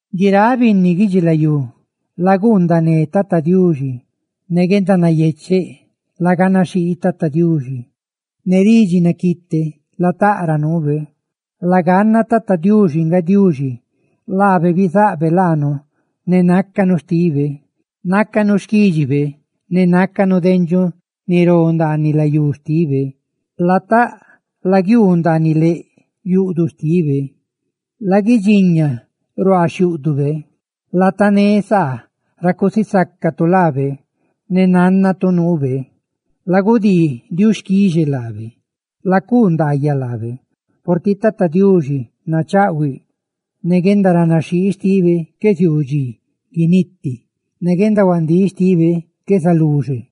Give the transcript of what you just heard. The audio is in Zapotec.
¡Guiráꞌ binni guidxilayú, laguundané Tata Diuxi nayecheꞌ! Ne guendanayecheꞌ laganaxhii Tata Diuxi; ¡ne ridxi naquiite lataꞌ ra nuube! Laganna, Tata Diuxi nga Diuxi; laabe bizaꞌbe laanu ne nácanu xtibe; ¡nácanu xquídxibe ne nácanu dendxuꞌ ni ró ndaaniꞌ layú xtibe! Lataꞌ laguiuu ndaaniꞌ leꞌ yuꞌduꞌ xtibe ne laguidxiña ruaa xhiúꞌdube, latané saa ra cusisácatu laabe ne nánnatu nuube. ¡Lagudii diuxquixe laabe, lacuu ndaayaꞌ lábe! Purtiꞌ Tata Diuxi nachaꞌhuiꞌ; ne guendaranaxhii xtibe qué ziuu dxi guiniti, ne guendahuandíꞌ xtibe qué zaluxe.